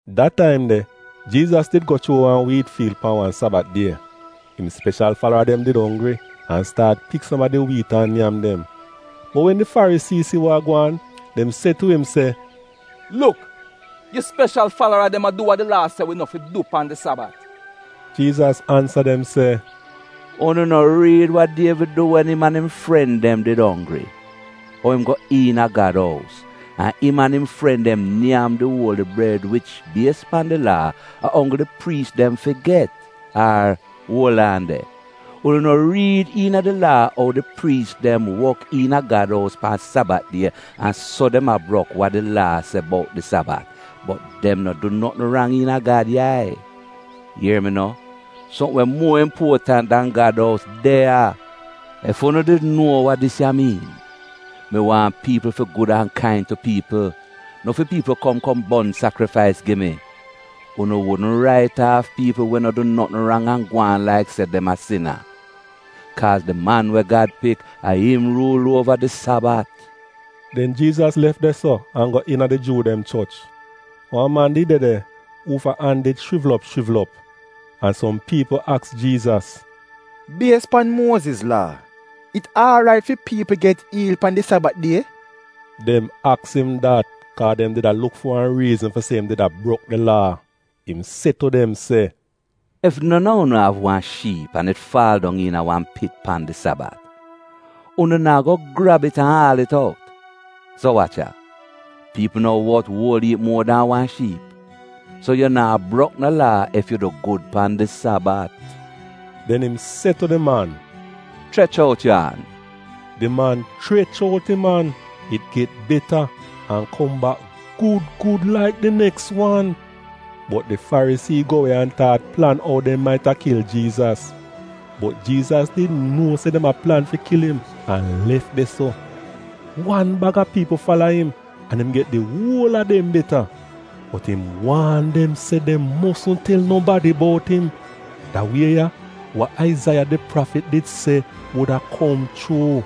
Da taim de, Jiizas did go chuu wan wiit fiil pan wan Sabat die. Im speshal falara dem did onggri an staat pik som a di wiit an nyam dem. Bot wen di Farisii si wa a gwaan dem se tu im se, “Luk! Yu speshal falara dem a du wa di Laa se wi no fi du pan di Sabat?” Jiizas ansa dem se, “Unu no riid wa Dievid du wen im an im fren dem did onggri? Ou im go iina Gad ous, an im an im fren dem nyam di uoli bred wich, bies pan di Laa, a onggl di priis dem fi get?” “Ar, uol aan de, unu no riid iina di Laa ou di priis dem wok iina Gad ous pan Sabat die an so dem a brok wa di Laa se bout di Sabat, bot dem no du notn rang iina Gad yai. Ier mi no, sopm we muo impuotant dan Gad ous de ya. Ef unu did nuo wa dis ya miin: ‘Mi waahn piipl fi gud an kain tu piipl, no fi piipl kom kom bon sakrifais gi mi,’ unu wudn rait aaf piipl we no du notn rang an gwaan laik se dem a sina. Kaaz di Man we Gad Pik, a im ruul uova di Sabat.” Den Jiizas lef de-so an go iina di Juu dem choch. Wan man did de de uufa an did shrivl op shrivl op. An som piipl aks Jiizas, “Bies pan Muoziz Laa, it aarait fi piipl get iil pan di Sabat die?” Dem aks im dat kaa dem did a luk fi wan riizn fi se im did a brok di Laa. Im se tu dem se, “Ef non a unu av wan shiip an it faal dong iina wan pit pan di Sabat, unu naa go grab it an aal it out? So wach ya, piipl no wot uol iip muo dan wan shiip? So yu naa brok no laa ef yu du gud pan di Sabat.” Den im se tu di man, “Chrech out yu an.” Di man chrech out im an, it get beta, an kom bak gud gud laik di neks wan. Bot di Farisii dem go we an staat plan ou dem maita kil Jiizas. Bot Jiizas did nuo se dem a plan fi kil im an lef de-so. Wan bag a piipl fala im, an im get di uol a dem beta. Bot im waan dem se dem mosn tel nobadi bout im. Da wie ya, wa Aizaiya, di prafit, did se wuda kom chuu: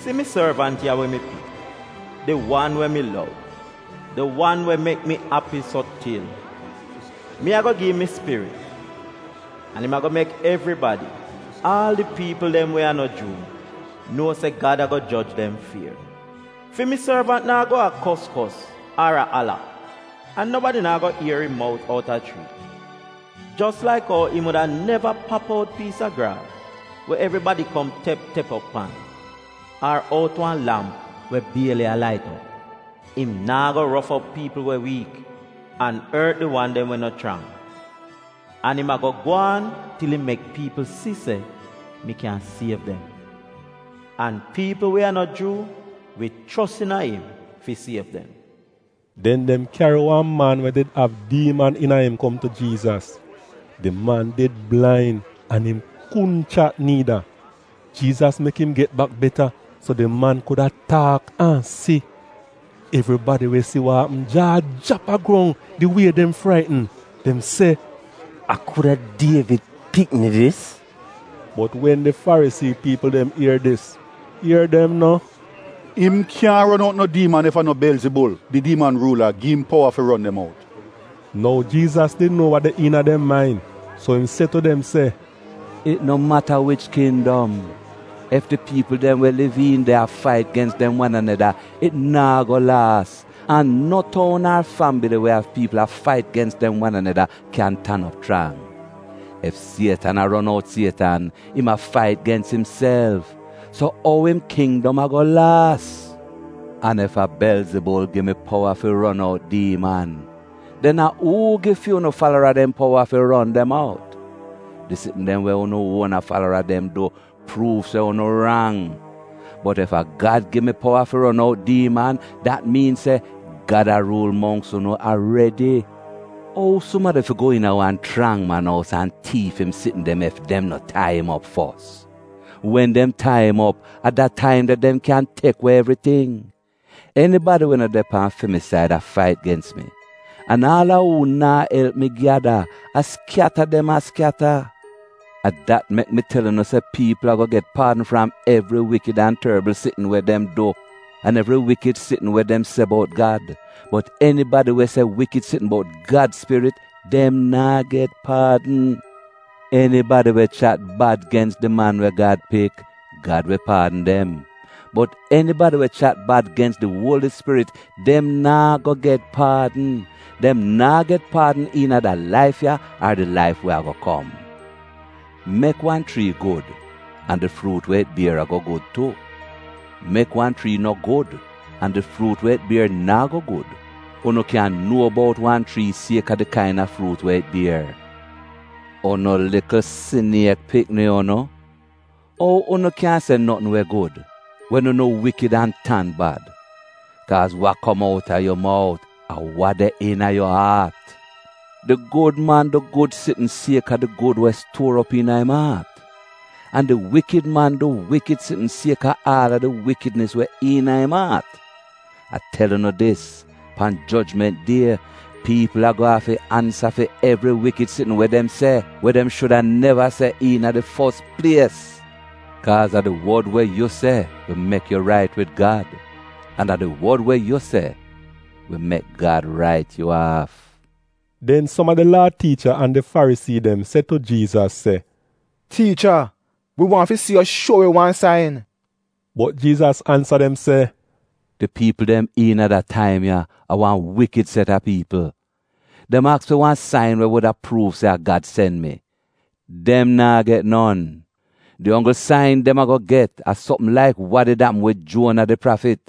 “Si mi sorvant ya we mi pik, di wan we mi lov, di wan we mek mi api so til. Mi ago gi'im mi Spirit, an im ago mek evribadi, aal di piipl dem we a no Juu, nuo se Gad ago joj dem fier. Fi mi sorvant naa go a kos kos ar a ala, an nobadi naa go ier im mout outa chriit. Jos laik ou im wuda neva pap out piis a graas we evribadi kom tep tep op pan, ar out wan lamp we bieli a flika, im naa go rof op piipl we wiik an ort di wan dem we no chrang. An im ago gwaan til im mek piipl si se mi kyan siev dem. An piipl we a no Juu wi chos iina im fi siev dem. Den dem kyari wan man we did av diiman iina im kom tu Jiizas. Di man did blain an im kudn chat niida. Jiizas mek im get bak beta, so di man kuda taak an si. Evribadi we si wa apm jaa jrap a grong di wie dem fraitn. Dem se, “A kuda Dievid pikni dis?” Bot wen di Farisii piipl dem ier dis, ier dem no, “Im kyaahn ron out no diiman ef a no Belzibul, di diiman ruula, gi im powa fi ron dem out.” Nou, Jiizas did nuo wa de iina dem main, so im se tu dem se, “It no mata wich kindom, ef di piipl dem we liv iin de a fait gens dem wan aneda, it naa go laas. An no toun ar fambili we av piipl a fait gens dem wan aneda kyan tan op chrang. Ef Sietan a ron out Sietan, im a fait gens imself. So ou im kindom ago laas? An ef a Belzibul gi mi powa fi ron out diiman, den a uu gi fi unu falara dem powa fi ron dem out? Di sitn dem we unu uona falara dem du, pruuv se unu rang. Bot ef a Gad gi mi powa fi ron out diiman, dat miin se Gad a ruul mongks unu aredi. “Ou sumadi fi go iina wan chrang man ous an tiif im sitn dem ef dem no tai im op fos? Wen dem tai im op a da taim de dem kyan tek we evriting. “Enibadi we no de pan fi mi said, a fait gens mi, an aal a uu naa elp mi gyada, a skyata dem a skyata. A dat mek mi tel unu se piipl ago get paadn fram evri wikid an torbl sitn we dem du an evri wikid sitn we dem se bout Gad, bot enibadi we se wikid sitn bout Gad Spirit dem naa get paadn. Enibadi we chat bad gens di Man we Gad Pik, Gad wi paadn dem. Bot enibadi we chat bad gens di Uoli Spirit, dem naa go get paadn. Dem naa get paadn iina da laif ya ar di laif we ago kom. “Mek wan chrii gud, an di fruut we it bier ago gud tu; mek wan chrii no gud, an di fruut we it bier naa go gud. Unu kyan nuo bout wan chrii sieka di kaina fruut we it bier. Unu likl siniek pikni unu! Ou unu kyan se notn we gud, wen unu wikid an tan bad? Kaaz wa kom outa yu mout, a wa de iina yu aat. Di gud man du gud sitn sieka di gud we stuor op iina im aat. An di wikid man du wikid sitn sieka aal a di wikidnis we iina im aat. A tel unu dis, pan jojment die, piipl ago afi ansa fi evri wikid sitn we dem se, we dem shuda neva se iina di fos plies. Kaaz a di wod we yu se wi mek yu rait wid Gad, an a di wod we yu se wi mek Gad rait yu aaf.” Den som a di Laa tiicha an di Farisii dem se tu Jiizas se, ‘Tiicha wi waahn si yu shuo wi wan sain.’ Bot Jiizas ansa dem se, “Di piipl dem iina da taim ya, a wan wikid set a piipl. Dem aks fi wan sain we wuda pruuv se a Gad sen mi. Dem naa get non! Di onggl sain dem ago get a sopm laik wa did apm wid Juona di prafit.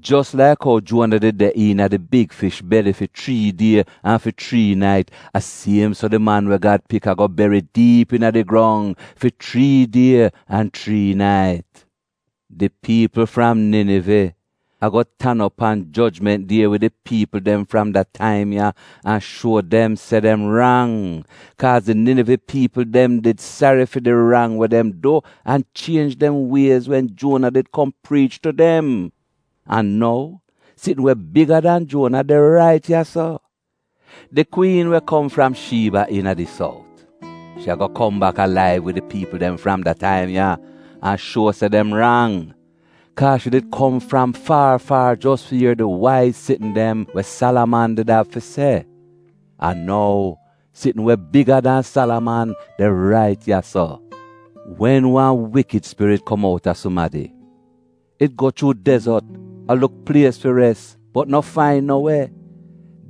Jos laik ou Juona did de iina di big fish beli fi chrii die an fi chrii nait, a siem so di Man we Gad Pik ago beri diip iina di grong fi chrii die an chrii nait. Di piipl fram Ninive, ago tan op pan jojment die wid di piipl dem fram da taim ya an shuo dem se dem rang. Kaaz di Ninive piipl dem did sari fi di rang we dem du an chienj dem wiez wen Juona did kom priich tu dem. An nou, sitn we biga dan Juona de rait ya-so. Di kwiin we kom fram Shiiba iina di sout, shi ago kom bak alaiv wid di piipl dem fram da taim ya an shuo se dem rang, kaa shi did kom fram faar faar jos fi ier di waiz sitn dem we Salaman did av fi se. An nou, sitn we biga dan Salaman de rait ya-so. “Wen wan wikid spirit kom outa sumadi, it go chuu dezot, a luk plies fi res bot no fain no we.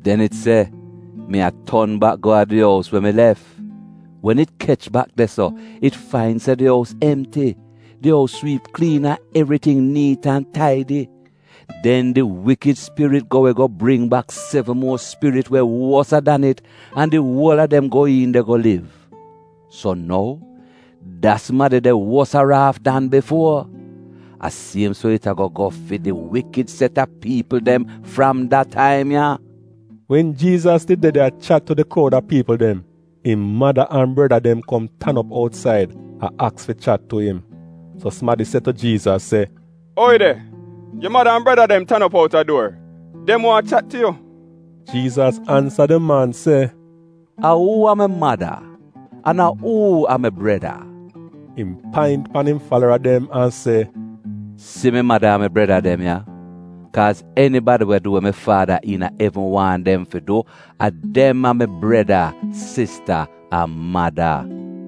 Den it se, ‘Mi a ton bak go a di ous we mi lef.’ Wen it kech bak de-so, it fain se di ous emti. Di ous swiip kliin an evriting niit an taidi. Den di wikid spirit go we go bring bak sevn muo spirit we wosa dan it an di uol a dem go iin de go liv. So nou, da sumadi de wosaraaf dan bifuo. A siem so it ago go fi di wikid set a piipl dem fram da taim ya!” Wen Jiizas did de de a chat tu di kroud a piipl dem, im mada an breda dem kom tan op outsaid a aks fi chat tu im. So sumadi se tu Jiizas se, “Oi de, yu mada an breda dem tan op outa duor. Dem waahn chat tu yu.” Jiizas ansa di man se, “A uu a mi mada, an a uu a mi breda?” Im paint pan im falara dem an se, “Si mi mada an mi breda dem ya! Kaaz enibadi we du wa mi Faada iina evn waahn dem fi du, a dem a mi breda, sista an mada.”